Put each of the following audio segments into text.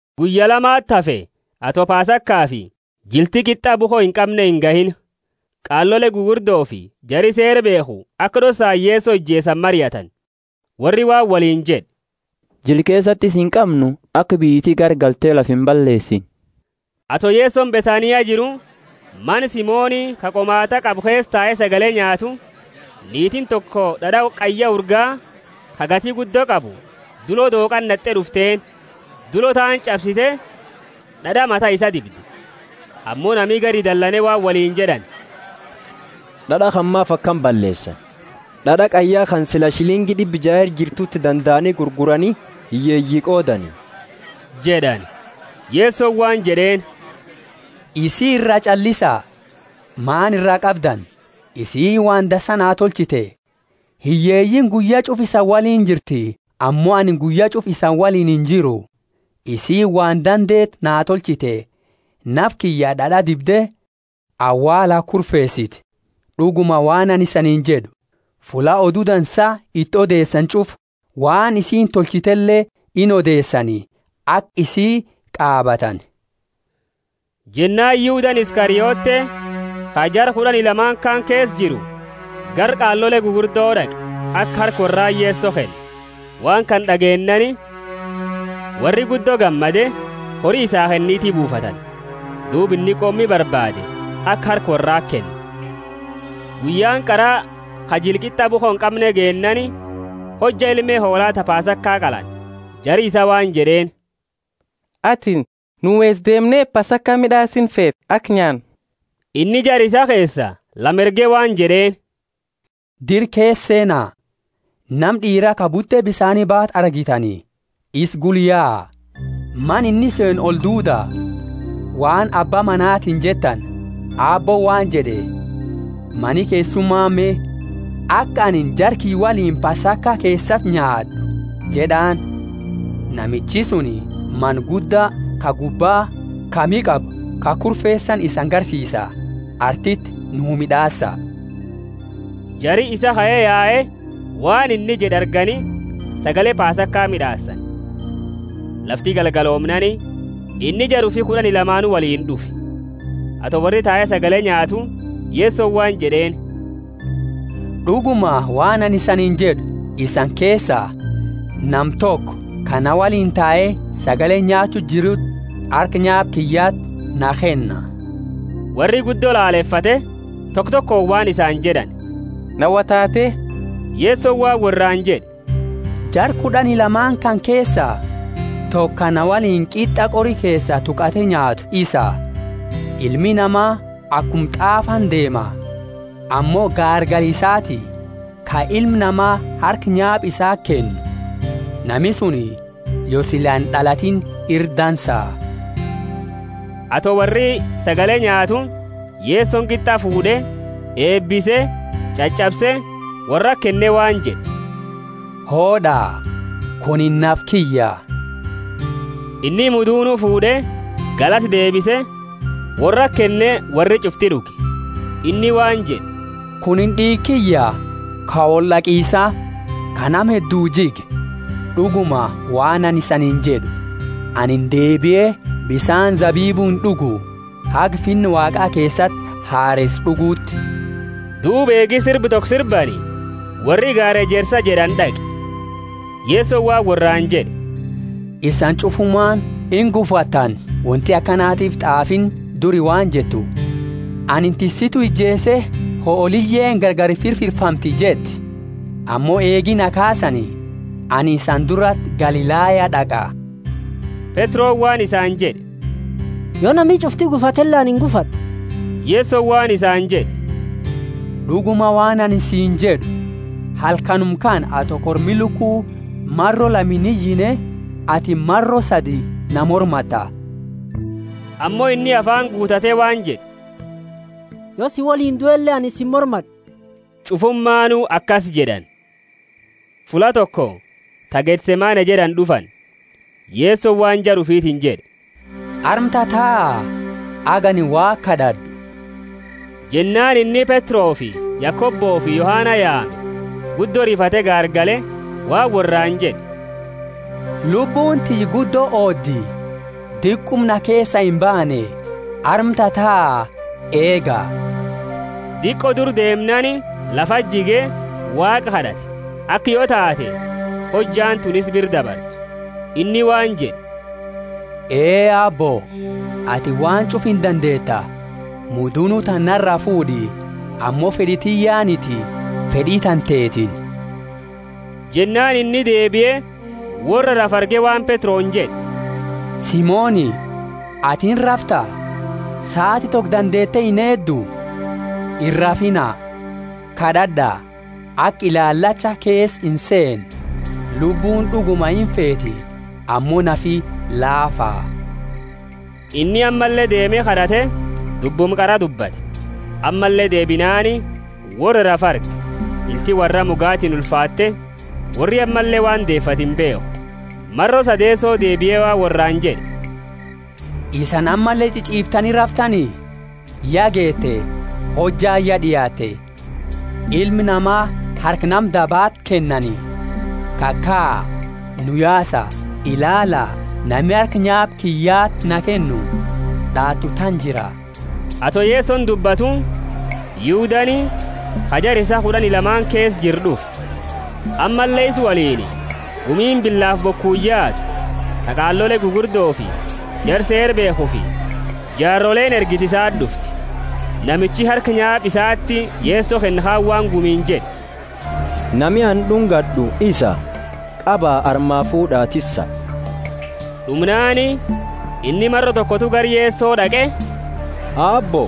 Guyya lamati hafe ato Pasakafi jilti Qit'a bukho inqamne ingahiini. Qaalole gugurdofi jari Seera beekhu aka d'ossaani Yeso ijeesani mariatani. Worri waan woliini jed'e, Jila keesati isa inqamnu, aka biyyiti garagalte lafa imballeesine. Ato Yesoni Bethania jiru, mana Simoni ka qomaat'a qabu keesa tae sagale nyaatu, niitiini toko d'ad'a qayya urgaa, ka gati guddo qabu, dulo dooqati nat'e d'ufteeni. Dulo taani ch'absite, d'ad'a mata isaa dibde. Ammo nami gari dalane waan woliini jed'ani, D'ad'a kana maafi akana balleesani? D'ad'a qayya kana sila shilingi d'ibba jaa ira jirtuti dandaani gurgurani, hiyyeeyi qoodani jed'ani. Yesoni waan jed'eeni, Isii iraa ch'allisa, maani iraa qabdani? Isiini waan dansa naa tolchite. Hiyyeeyiini guyya ch'ufa isani woliini jirti, ammo anini guyya ch'ufa isani woliini injiru. Isiini waan dandeetu naa tolchite, nafa kiyya d'ad'a dibde, awaala kurfeesite. D'uguma, waan anini isaniini jed'u, fulla Odu Dansa iti odeesani ch'ufa, waan isiini tolchitele inodeesani, aka isi qaabatani. Jennaani Yudani Iskariote, ka jara kud'ani lama kaani keesa jiru, gara qaalole gugurdo d'aqe, aka harka worrati Yeso kennu. Waan kana d'ageennaani, worri guddo gammade, hori isaa kenniti buufatani. Duuba inni qoomni barbaade, aka harka worrati kennu. Guyyaani qara ka jila Qit'a bukho inqamne geennaani, hojja ilme hoola ta Pasaka qalani, jari isaa waan jed'eeni, Atini nu eesa deemne Pasaka mid'aasinu feeta, aka nyaannu? Inni jara isaa keesa lama erge waan jed'eeni, Dira keesa seena, nama d'iira ka bute bisaani baatu argitani. Isa gula yaa, mana inni seenu olduuda, waan abba manatiini jettani, Aabbooni waan jed'e, Mani keessuma me, aka anini jara kiyya woliini Pasaka keesati nyaad'u? jed'aani. Namichi suni mana gudda, ka gubbaa, ka miha qabu, ka kurfeesani isani garsiisa, artiti nuu mid'aasa. Jari isaa kae yae, waan inni jed'e argani, sagale Pasaka mid'aasani. Lafti galgaloomnaani, inni jara ufi kud'ani lamaanu woliini d'ufe. Ato worri tatae sagale nyaatu, Yesoni waan jed'e, D'uguma, waan anini isaniini jed'u, Isani keesa, nama toko ka na woliini tae sagale nyaachu jiruti harka nyaapa kiyyati na kenna. Worri guddo lalefate, toko tokooni waan isaani jed'ani, Na wo taate? Yesoni waan worraani jed'e, Jara kud'ani lamaani kana keesa, toko ka na woliini qit'a qori keesa tuqate nyaatu isa. Ilmi Nama akuma t'aafani deema, ammo gaargala isaati, ka Ilma Nama harka nyaapa isati kennu! Nami suni, yo sila ind'alatiini, ira dansa! Ato worri sagale nyaatu, Yesoni qit'a fuud'e, eebise, ch'ach'abse, worrati kenne waan jed'e, Hood'a, kunini nafa kiyya. Inni mudunu fuud'e, galata deebise, worrati kenne, worri ch'ufti d'uge. Inni waan jed'e, Kunini d'iiga kiyya, ka wold'aqisa, ka nama hedduu jige. D'uguma, waan anini isaniini jed'u, Anini deebie bisaani zabibu ind'ugu, haga Finna Waaqa keesati hareesa d'uguuti. Duuba eegi sirba toko sirbani, worri gaara Ejersa jed'ani d'aqe. Yesoni waan worraani jed'e, Isani ch'ufumaani ingufattani; wonti akanatiifi t'aafiini duri waan jettu, Anini tissitu ijeese, hooliyeeni gargari firfirfamti jetti. Ammo eegi na kaasani, anini isani durati Galilaya d'aqa. Petroni waan isani jed'e, Yo nami ch'ufti gufatele, anini ingufad'u. Yesoni waan isaani jed'e, D'uguma, waan anini siini jed'u, Halkanuma kana, ato kormi luku maro lama iniyine, atini maro sadi na mormatta. Ammo inni afaani guutate waan jed'e, Yo si woliini duele anini si imormad'u. Ch'ufumaanu akasi jed'ani. Fulla toko ta Gethsemane jed'ani d'ufani; Yesoni waan jara ufitiini jed'e, Arma tataa, haga anini Waaqa kad'ad'u. Jennaani inni Petrofi Yakobofi Yohana yaame, guddo rifate gaargale waan worraani jed'e, Lubbuuni tiyya guddo oodi, diquma na keesaa imbaane, arma tataa, eega. Diqo dura deemnaani, lafati jige, Waaqa kad'ate, aka yo taate, hojjaani tuni isa bira dabartu. Inni waan jed'e, Ee Aabbo, atini waan ch'ufa indandeeta, mudunu tana naraa fuud'i, ammo fed'i tiyyaaniti, fed'i tantetiini. Jennaani inni deebie, worra rafu arge waan Petroni jed'e, Simoni, atini irrafta? Saati toko dandeete ineeddu? Irrafiina, kad'ad'a, aka ilaalachaa keesa inseenne. Lubbuuni d'uguma imfeeti, ammo nafi laafa. Inni ammalle deeme kad'ate, dubbuma qara dubbate. Ammalle deebinaani, worra rafu arge, ilti worraa mugatiini ulfaatte, worri ammalle waan deefatu imbeekhu. Maro sadeeso deebie waan worraani jed'e, Isani ammalle ch'ich'iiftani raftani? Ya geete, hojjaani ya d'iaatte, Ilma Nama harka nama dabati kennani. Kakaa, nu yaasa, ilaala, nami harka nyaapa kiyyati na kennu d'aatu tana jira. Ato Yesoni dubbatu, Yudani, ka jara isaa kud'ani lamaani keesa jiru d'ufe; ammalle isa woliini gumiini bilaafi bokuuni yaatu, ta qaalole gugurdofi jara Seera beekhufi jaaroleeni ergite isati d'ufte. Namichi harka nyaapa isaati Yeso kennu kaani waan gumiini jed'e, Nami anini d'ungad'u isa, qaba, armaa fuud'a, tissa. D'umnaani, inni maro tokotu gara Yeso d'aqe, Aabbo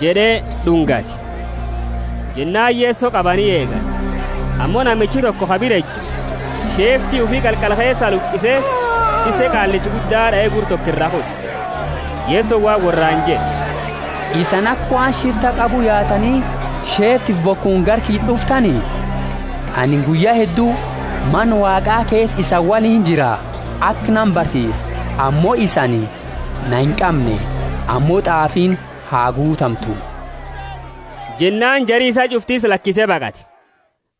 jed'e d'ungate. Jennaani Yeso qabani eegani. Ammo namichi toko ka bira eju, sheefti ufi qalqala keesaa luqise, tisse qaallicha gudda d'ae, gurra toko iraa kute. Yesoni waan worraani jed'e, Isani aka waan shifta qabu yaatani, sheeftifi bokuuni gara kiyya d'uftani? Anini guyya heddu Mana Waaqa keesa isani woliini jira, aka nama barsiisu, ammo isani na inqamne. Ammo t'aafiini ha guutamtu. Jennaani jari isaa ch'ufti isa lakise baqate.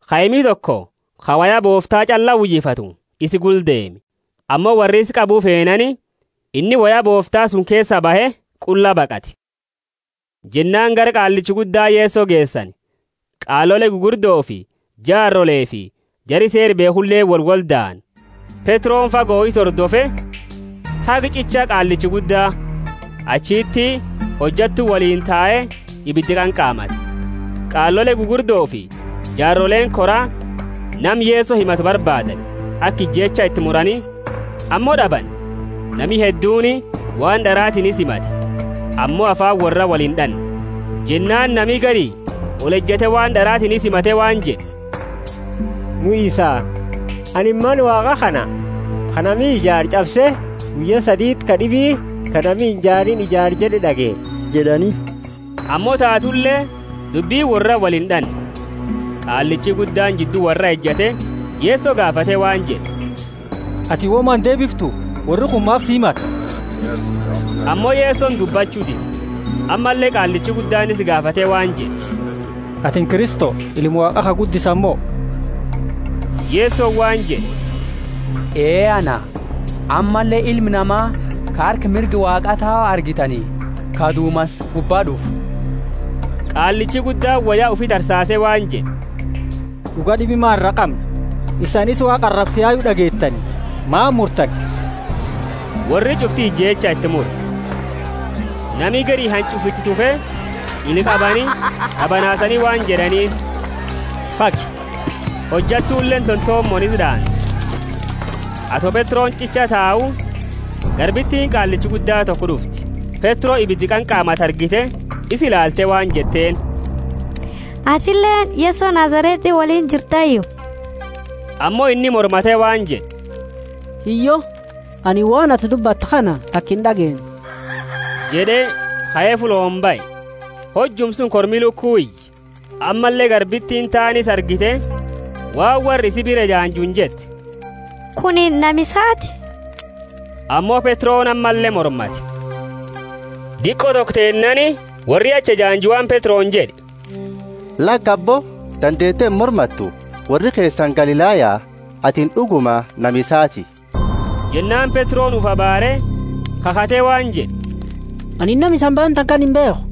Kaimi toko, ka woya boofta ch'alla uyifatu, isa gula deeme. Ammo worri isa qabu feenaani inni woya boofta suni keesaa bahe, qulla baqate. Jennaani gara qaallicha gudda Yeso geesani; qaalole gugurddofi jaarolefi jari Seera beekhuleeni wolwoldaani. Petroni fago isa hordofe, haga ch'icha qaallicha gudda. Achiti hojattu woliini tae ibida qanqaamate. Qaalole gugurdofi jaaroleeni koraa nama Yeso himatu barbaadani, aka ijeecha iti murani, ammo d'abani. Nami hedduuni waan d'aratiini isa himate, ammo afaani worra wolind'anne. Jennaani nami gari olejate waan d'aratiini isa himate waan jed'e, Nu isa, Anini Mana Waaqa kana, ka nami ijaare, ch'abse, guyya saditi kad'ibi ka nami inijaariini ijaara jed'u d'ageenne jed'ani. Ammo taatule, dubbini worraa wolind'anne. Qaallichi guddaani jiddu worraa ejate, Yeso gaafate waan jed'e, Atini woma indeebiftu? Worri kuni maafi si himata? Ammo Yesoni dubbachu dide. Ammalle qaallichi guddaani isa gaafate waan jed'e, Atini Kristo, Ilma Waaqa ka guddisani mo? Yesoni waan jed'e, Ee, Ana; ammalle Ilma Nama ka harka mirga Waaqaa tau argitani, ka dumansa gubbatiini d'ufu! Qaallichi guddaani woya ufi tarsaase waan jed'e, D'uga d'ibi maani iraa qamna? Isani isa Waaqa arabsu ya d'ageetani. Maani murtani? Worri ch'ufti ijeecha iti mure. Nami gari hanch'ufa iti tufe, ila qabani, d'abanaasani waan jed'aniini, Fagi! Hojattuleeni tontomooni isa d'aante. Ato Petroni ch'icha tau, garbitiini qaallicha gudda toko d'ufte. Petro ibida qanqaamatu argite, isa ilaalte waan jetteeni, Atileeni Yeso Nazareti woliini jirtayu? Ammo inni mormate waan jed'e, Hiyyo, anini waan atini dubbattu kana taka ind'ageenne jed'e, kae fullooni bahe. Hojuuma suni kormi luku iye. Ammalle garbitiini taani isa argite, waan worra isi bira ejaanjuuni jette, Kunini nama isaati. Ammo Petroni ammalle mormate. Diqo toko teennaani, worri achi ejaanju waan Petroni jed'e, Laki abbo, dandeete imormattu, worri keesani Galilaya, atini d'uguma nama isaati. Jennaani Petro ufi abaare, khakhate waan jed'e, Anini nama isani baantani kana imbeekhu.